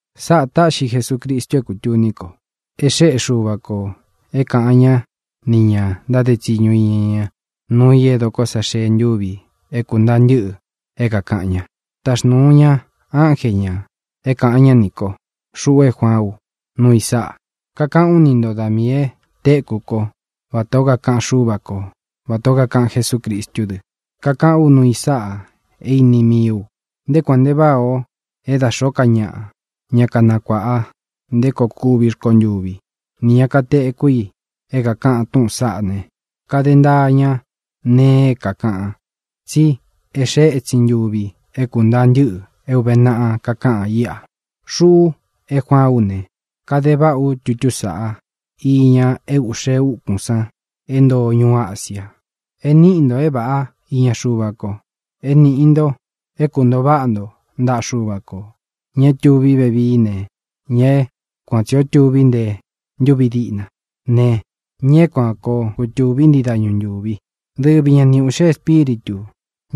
Sáꞌā táꞌxi Jesucristu é kūtuni ko. É xēꞌé Xuva kō é kāꞌan ñá nī ña ntáde tsiñu iña ña nuu i e dokó sa xee ntuvi é kūntaa ntɨ́ꞌɨ é kākaꞌan ña. Taxnūu ña ánje ñā é kāꞌan ñá nī kó, xuꞌu é Juaán u, nuu i sáꞌa. Kakaꞌán u ni nto da miī e tékú ko vatā ó kakaꞌan Xúva ko, vatā ó kakaꞌan Jesúcristú dɨ. Kakaꞌán u nuu i sáꞌa é īni mii u. Nté kuān nte váꞌā o é da xōó ka ñaꞌa, ña kanakuāꞌa nté koo kuvi rkontuví, nī ña é kāteku i é kākaꞌan túꞌūn saꞌá ne, kade ntaa ña nee é kākaꞌan, tsí e xée etsin ntuvi é kūntaa ntɨ́ꞌɨ é ūve naꞌa kakáꞌan íꞌa. Xuꞌu é Juaán u ne, kade váꞌa ú tutú sāꞌá iña é ūꞌxe úkūn san é ntoo ñuú Asia. É nīꞌi nto é vāꞌá iña Xuva ko. É nīꞌi nto é kuntōo váꞌa nto ntaꞌa Xuva kō, ña é tuví vevií ne, ña é kuan tsī ó tuví nte ntúvi diꞌna ne, ña é kuan koo kutūví ntii dañu ntūvi, dɨ́vi ña ni ūꞌxe espíritū,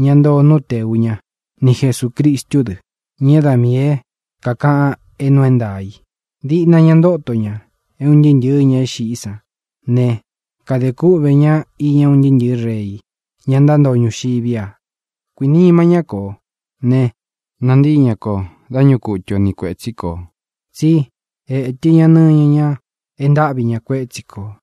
ña ntoo nú tēu ñá, ni Jesūcristú dɨ, ña é da miī é kākaꞌan é nuu é ntaā i. Diꞌna ña ntóto ña é un ntɨɨ́ ntɨ̄ɨ́ ña é xiꞌí san ne, kade kúꞌvē ña iña un ntɨɨ́ ntɨ̄ɨ́ rei, ña ntántoo ñuxiví a. Kuīnima ñá kō ne, nantíi ña kō dá ñuꞌu kutu o ni kuētsí kō, tsi étɨ ña nɨñɨ ñá e ntáꞌvi ña kuétsi kō.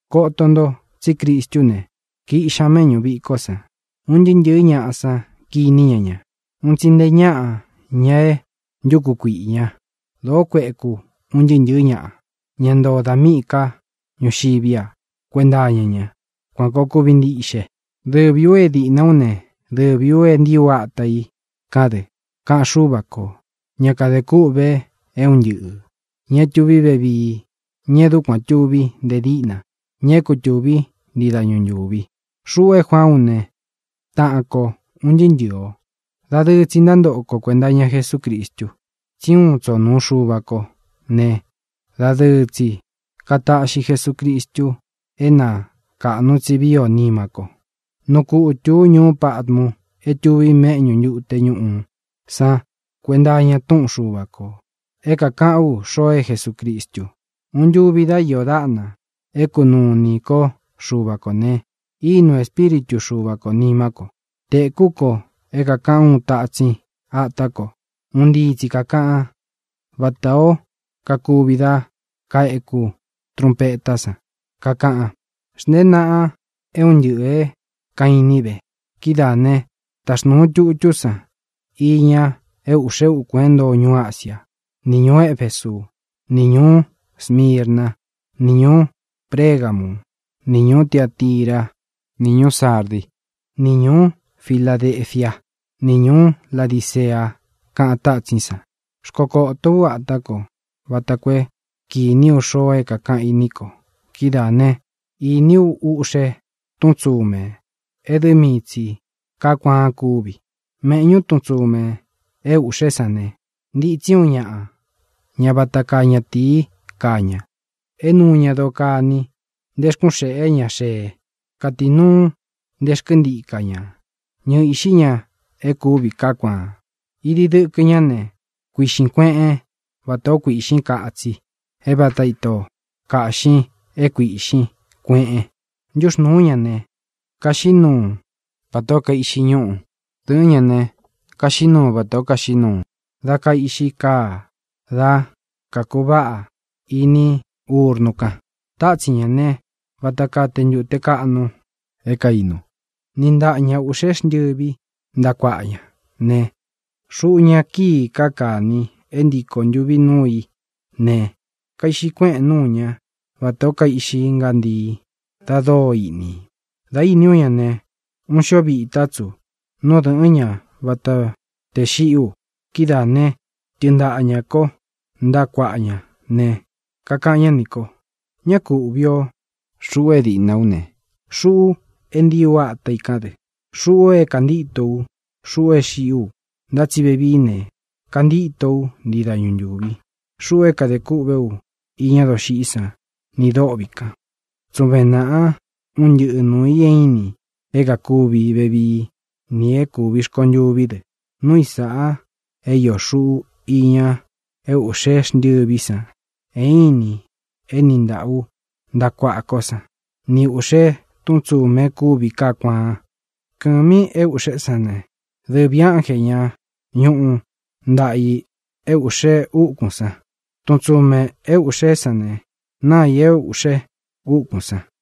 Koto nto tsí Cristú ne, kiꞌxi ña méꞌñu vīkó san. Un ntɨɨ́ ntɨ̄ɨ́ ñaꞌa sán kiní ña ña, un tsi nte ñáꞌa, ña é ntuku kuīꞌi ña. Dōó kueku un ntɨɨ́ ntɨ̄ɨ́ ñaꞌa, ña ntoo da míꞌī ká ñuxiví a, kuenta iña ña. Kuān koo kuvi ntiꞌxe. “Dɨvī ú e diꞌna ú ne, dɨvī ú é ntiī ú ata i kán dɨ”, kaꞌan Xúva kō, ña é kadē kûꞌve é un ntɨꞌɨ̄, ña é tuví vevií, ña e dúkuān tuví nte díꞌna, ña é kutūví ntii dañu ntūvi. Xuꞌu é Juaán u ne, taꞌan ko ūn ntɨɨ́ ntɨ̄ɨ o. Dadɨɨ tsi ntántoꞌo ko kuēnta iña Jesúcristu, tsí uun tsō nuu Xuva kó ne, dadɨɨ tsi kataꞌxi Jesucristu é na kāꞌnu tsi vii ó nima ko. Nuu kutū ú ñuú Patmu é tuvi méꞌñu ntute ñūꞌu san kuenta iña túꞌun Xuva kō, é kakaꞌán u xoo é Jesucristu. Uun ntuvi dá iō dáꞌna é kunūu iní ko Xuva kō ne, ínūu Espíritu Xuva kō nimá ko. Tēkú ko é kākaꞌan úun tatsin atá ko. Un ntii tsi kākaꞌan, vátā ó kakuvi dá kaeku trunpetá san. Kakaꞌan: —Xntēén naꞌan é un ntɨꞌɨ̄ é kaīnín ve. Kidáā ne, taxnuun tutú san iña é ūꞌxe úkūn é ntoo ñuú Asiá, ni ñūú Efesú, ni ñūú Smirná, ni ñūú Pregamú, ni ñūú Tiatirá, ni ñūú Sardí, ni ñūú Filadefiá, ni ñūú Ladicea —kaꞌan tátsín san. Xkokōtó u atá ko vata koo é kīní u xoo é kākaꞌan í nī ko. Kidáā né, īní u uꞌxe tún tsumē é dɨ mii tsī kaá kuaan kúvi. Méꞌñu tun tsumē é ūꞌxé san ne, ntitsí uun ñaꞌa, ña vata kaa ñatīí kaa ña, é nuu ña doo kani nte rkun xéꞌe ña xee. Katīnuu nté xkɨntika ña ñɨɨ īꞌxí ña e kúvi kaá kuaan. Idi dɨkɨ ñá ne, kuīꞌxin kueꞌen vátā ó kuīꞌxín katsi, é vāta ito kaꞌxin é kuīꞌxin kueꞌen. Ntuxnúu ñā ne, kaxiꞌí nuu vatā ó kaiꞌxí ñuꞌu. Dɨ̄ꞌɨ́n ña ne, kaxiꞌí nuu vatā ó kaxiꞌí nuu dá kaiꞌxi kaa dá kākuváꞌa ini urnu kan. Tátsin ñā né, vata kaa te ntūte kaꞌnu é kainu. Níꞌi ntaꞌa ña ūꞌxé xntɨvi ntaꞌa kuaꞌa ña ne, xuꞌu ña kíi káa kāni e ntíko ntuvi núu í ne, kaiꞌxi kuéꞌen núu ña, vatā ó kaiꞌxi ngántii da dóo iꞌni. Dā íni ú ña ne, uun xío vitá tsu nú dɨ̄ꞌɨ́n ña vata tē xiꞌí u. Kidáā ne, tɨɨn ntaꞌa ñā kó ntaꞌa kuaꞌa ña ne, kakaꞌan ñá nī ko: —Ñá ku ūꞌvi o. Xuꞌu é diꞌna ú ne, xuꞌu é ntiī ú ata i kán dɨ. Xuꞌu é kāntíto u. Xuꞌu é xiꞌí u, ntá tsi vevií ne, kantíto ú ntii dañu ntūvi. Xuꞌu é kadē kûꞌvé u iña doxiꞌí san nī dôꞌvi kan. Tsuven nāꞌán un ntɨꞌɨ nuū i é inin, é kākuvi vevií nī é kūví rkontuví dɨ. Núu i sāꞌa é iō xuꞌu iña é ūꞌxe xntɨvi san é inin é niꞌi ntāꞌa ú ntaꞌa kuaꞌa kó san, ni ūꞌxe tún tsumē e kúvi kaá kuaan. Kɨ̄mi é ūꞌxé san ne, dɨvī ánje, ña ñuꞌu ntāꞌa i é ūꞌxe úkūn san. Tun tsumē é ūꞌxé san ne, náa ī é ūꞌxe úkūn san.